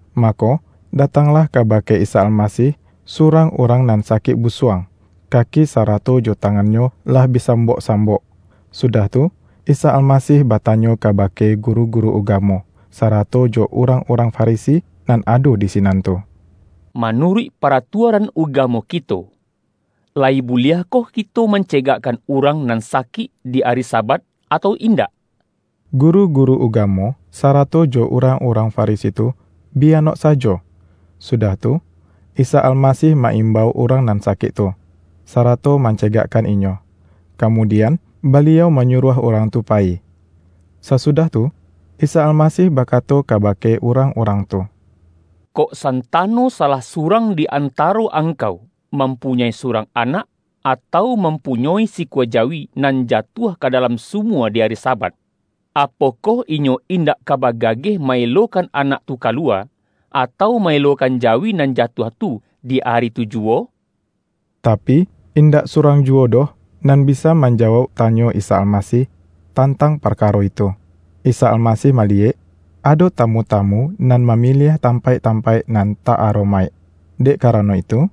Mako, datanglah kabake Isa Alma-sih, surang urang nan sakik busuang, kaki sarato jo tangannyo lah bi sam-bok-sambok. Sudah tu, Isa Almasih batanyo kabake guru-guru ugamo, sa-rato jo urang-urang Farisi nan ado di sinan tu,”Manuruik paratuaran uga-mo kito, layi buliahkoh kito mance-gakkan urang nan sakik di ari Sabat, atau indak?” Guru-guru ugamo, sarato jo urang-urang Farisi tu, bi anok sajo. Sudah tu, Isa Almasih ma-imbau urang nan sa-kik tu, sarato mancegakkan inyo, ka-mudian Baliau manyuruah urang tu payi. Sasudah tu, Isa Almasih baka-to kabake urang-urang tu,”Kok san-tano salah surang di antaro angkau, mampunyoi surang anak, atau mam-punyoi sikua jawi, nan jatuah ka da-lam sumua di ari Sabat, apokoh inyo indak ka bagageh ma-elokan anak tu kaluwa, atau ma-elokan jawi nan ja-tuah tu, di ari tu juwo?” Tapi, indak surang juwo doh, nan bisa manjawauk tanyo Isa Almasih tantang parkaro itu. Isa Almasih maliyek, ado tamu-tamu nan mamiliah tampaik-tam-paik nan ta-aromaik. Dek karano itu,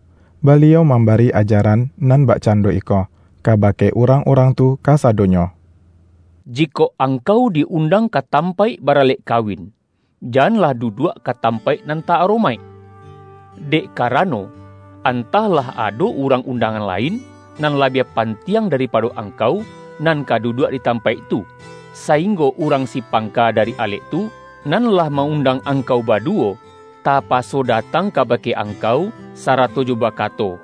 Baliau mambari ajaran nan bakcan-do iko, kabake urang-urang tu kasadonyo. ”Jikok angkau di-undang ka tampaik baralek kawin, janlah duduak ka tampaik nan ta-aromaik. Dek ka-rano, antah lah ado urang undangan lain, nan labiah pantiang daripado angkau, nan ka duduak di tampaik tu, sainggo urang si pangka dari alek tu, nan lah ma-undang angkau badu-wo, tapaso datang kabake angkau, sa-rato jo bakato, ’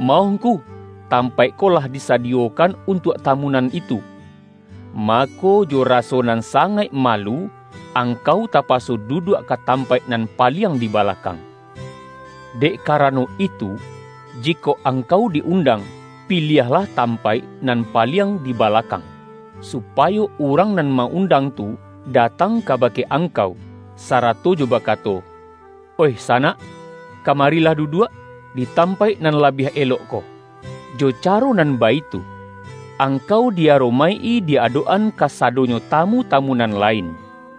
Maoh ngku, tampaik ko lah disadiyokan untuak tamu nan itu.’ Mako, jo raso nan sangaik ma-lu, angkau tapaso duduak ka tampaik nan paliang di balakang. Dek ka-rano itu, jikok angkau di-undang, pi-liahlah tampaik nan paliang di bala-kang, supayo urang nan ma-undang tu datang kabake angkau, sarato jo ba-kato, ’Oih sanak, kamarilah duduak, di tampaik nan labiah elok ko.’ Jo ca-ro nan baitu, angkau di-aromaik-i di adok-an kasadonyo tamu-tamu nan la-in.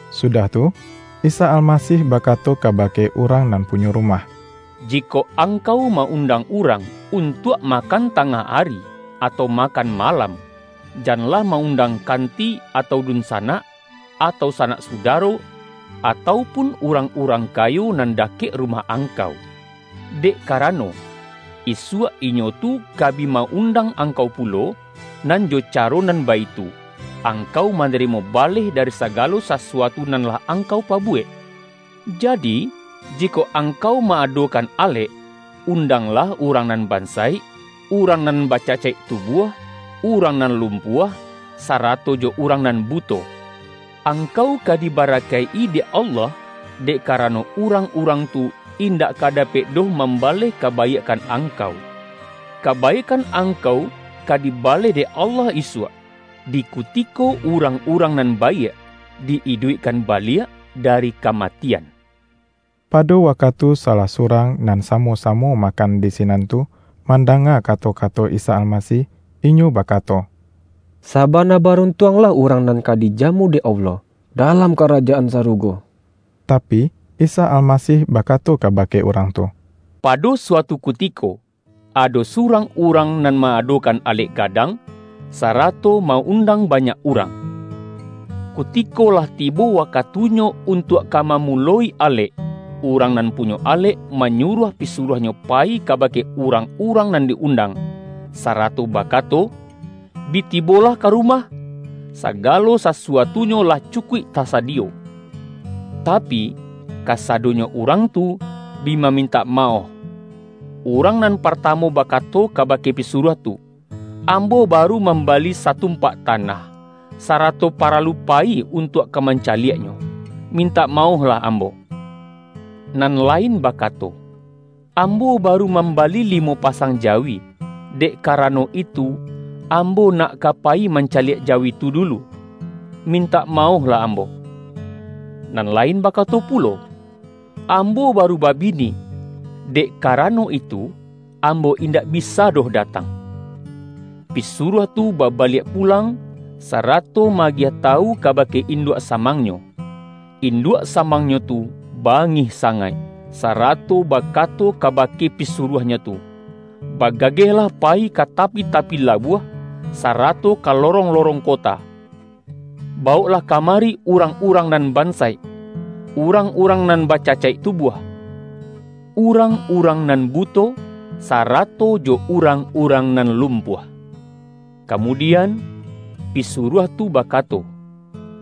Sudah tu, Isa Almasih bakato ka-bake urang nan punyo rumah,”Jikok angkau ma-undang urang, untuak ma-kan tangah ari, atau makan malam, janlah ma-undang kanti atau dun-sanak, atau sanak sudaro, atau pun urang-urang kayo nan dakek rumah angkau. Dek karano, isuak inyo tu ka bi ma-undang angkau pulo, nan jo ca-ro nan baitu, angkau manarimo baleh dari sagalo sasuatu nan lah angkau pabuwek. Jadi, jikok angkau ma-adokan alek, undanglah urang nan bansaik, urang nan bacacaik tubuah, urang nan lumpuah, sarato jo urang nan buto. Angkau ka dibarakaik-i dek Allah, dek karano urang-urang tu indak ka dapek doh mambaleh ka-baiakkan angkau. Kabaiakkan angkau ka dibaleh dek Allah isuak, di kutiko urang-urang nan baiak di-iduikkan baliak dari kamatian.” Pado wakatu salah surang nan sa-mo-samo makan di sinan tu, manda-nga kato-kato Isa Almasih, inyo ba-kato,”Sabana baruntuanglah urang nan ka dijamu dek Allah, dalam Ka-rajaan Sarugo!” Tapi, Isa Almasih bakato kabake urang tu,”Pado suatu kutiko, ado su-rang urang nan ma-adokan alek ga-dang, sarato ma-undang banyak urang. Kutiko lah tibo wakatunyo untuak ka mamuloi alek, urang nan punyo alek, manyuruah pisuruahnyo payi kabake urang-urang nan di-undang, sarato ba-kato, ’Bi tibolah ka rumah, sagalo sa-suatunyo lah cukuik tasadiyo!' Tapi, kasadonyo urang tu, bi mamintak ma-oh. Urang nan partamu bakato kabake pisuruah tu, ’Ambo baru mambali sa-tumpak tanah, sarato paralu payi un-tuak ka mancaliaknyo. Mintak maoh-lah ambo.’ Nan lain bakato, ’Ambo baru mambali limo pasang jawi, dek karano itu, ambo nak ka payi man-caliak jawi tu dulu. Mintak maohlah ambo.’ Nan lain bakato pulo, ’Ambo baru babini, dek karano itu, ambo in-dak bisa doh datang.’ Pisuruah tu babaliak pulang, sa-rato ma-agiah tawu kabake induak sa-mangnyo. Induak samangnyo tu ba-ngih sangaik, sarato bakato kabake pisuruahnyo tu, ’Bagagehlah payi ka tapi-tapi labuah, sarato ka lorong-lo-rong kota. Bawoklah kamari urang-urang nan bansaik, urang-urang nan bacacaik tubuah, urang-urang nan buto, sarato jo urang-urang nan lum-puah.’ Kamudian, pisuruah tu baka-to,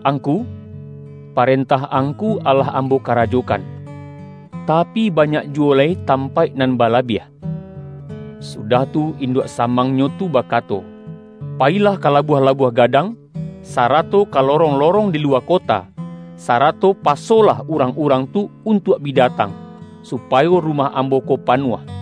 ’Angku, parentah angku alah am-bo karajokan, tapi, banyak juwo lai tampaik nan balabiah.’ Sudah tu, induak samangnyo tu bakato, ’Payi-lah ka labuah-labuah gadang, sarato ka lorong-lorong di luwa kota, sarato pasolah urang-urang tu untuak bi da-tang, supayo rumah ambo ko panuah.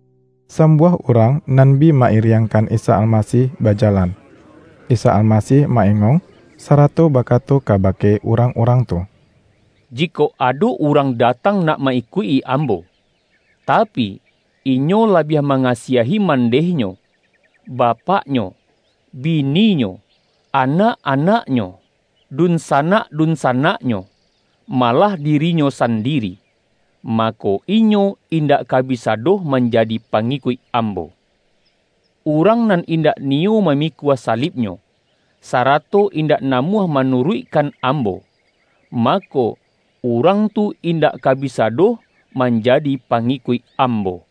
Sambuah urang nan bi ma-iriang-kan Isa Almasih bajalan. Isa Almasih ma-engong, sarato bakato kabake urang-urang tu, ”Jikok ado urang da-tang nak ka ma-ikuik Ambo, tapi, inyo labiah mangasiahi, mandehnyo, bapak-nyo, bininyo, anak-anaknyo, dunsanak-dunsanaknyo, malah dirinyo sandiri, mako inyo indak ka bisa doh manjadi pangikuik Ambo. Urang nan indak niyo mamikua salibnyo, sarato indak namuah manuruikkan Ambo, mako, urang tu indak ka bisa doh manjadi pangikuik Ambo.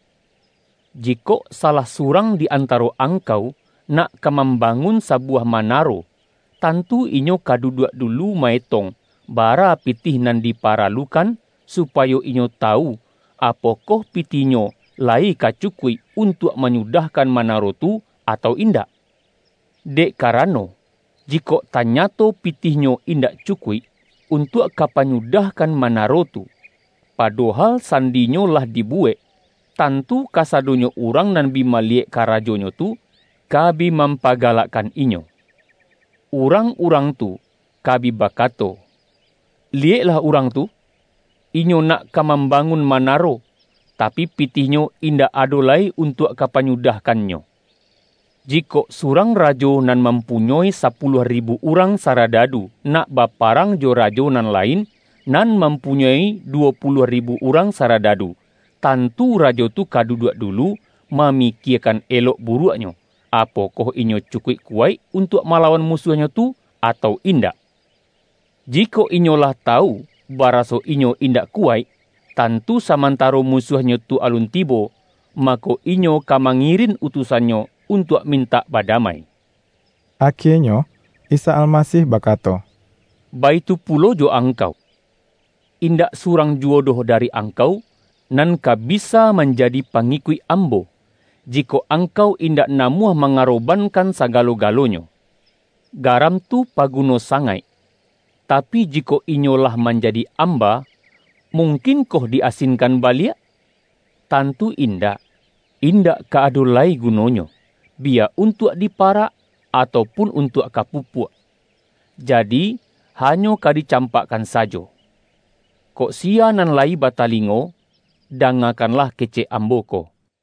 Jikok salah su-rang di antaro angkau, nak ka mam-bangun sabuwah manaro, tantu inyo ka duduak dulu ma-etong, bara pitih nan diparalukan, supayo inyo tawu, apokoh pitihnyo layi ka cukuik, untuak manyudahkan manaro tu, atau indak. Dek karano, jikok tanyato pitihnyo indak cukuik, untuak ka panyudahkan manaro tu, padohal sandinyo lah di-buwek, tantu kasadonyo urang nan bi maliyek karajonyo tu, ka bi mampaga-lakkan inyo. Urang-urang tu, ka bi bakato, ’Liyeklah urang tu, inyo nak ka mambangun manaro, tapi, pitih-nyo indak ado lai untuak ka panyu-dahkannyo!' Jikok surang rajo nan mampunyoi sapuluah ribu urang sa-radadu, nak baparang jo rajo nan la-in, nan mampunyoi duwo puluah ri-bu urang saradadu, tantu rajo tu ka duduak dulu, mamikiekan elok bu-ruaknyo, apokoh inyo cukuik kuwaik untuak malawan musuahnyo tu, atau indak? Jikok inyo lah tawu baraso inyo indak kuwaik, tantu samantaro musuahnyo tu alun tibo, mako, inyo ka mangirin utusannyo untuak min-tak badamai.” Akienyo, Isa Almasih bakato,”Baitu pulo jo angkau. Indak surang juwo doh dari angkau, nan ka bisa manjadi pangikuik Ambo, jikok angkau indak namuah mangaroban-kan sagalo-galonyo.” ”Garam tu paguno sangaik, tapi, jikok inyo lah manjadi amba, mung-kinkoh di-asinkan baliak? Tantu in-dak, indak ka ado lai gunonyo, biya untuak di parak, atau pun untuak ka pupuak. Jadi, hanyo ka dicampakkan sajo. Kok siya nan layi batalingo, da-ngakanlah kecek Ambo ko!”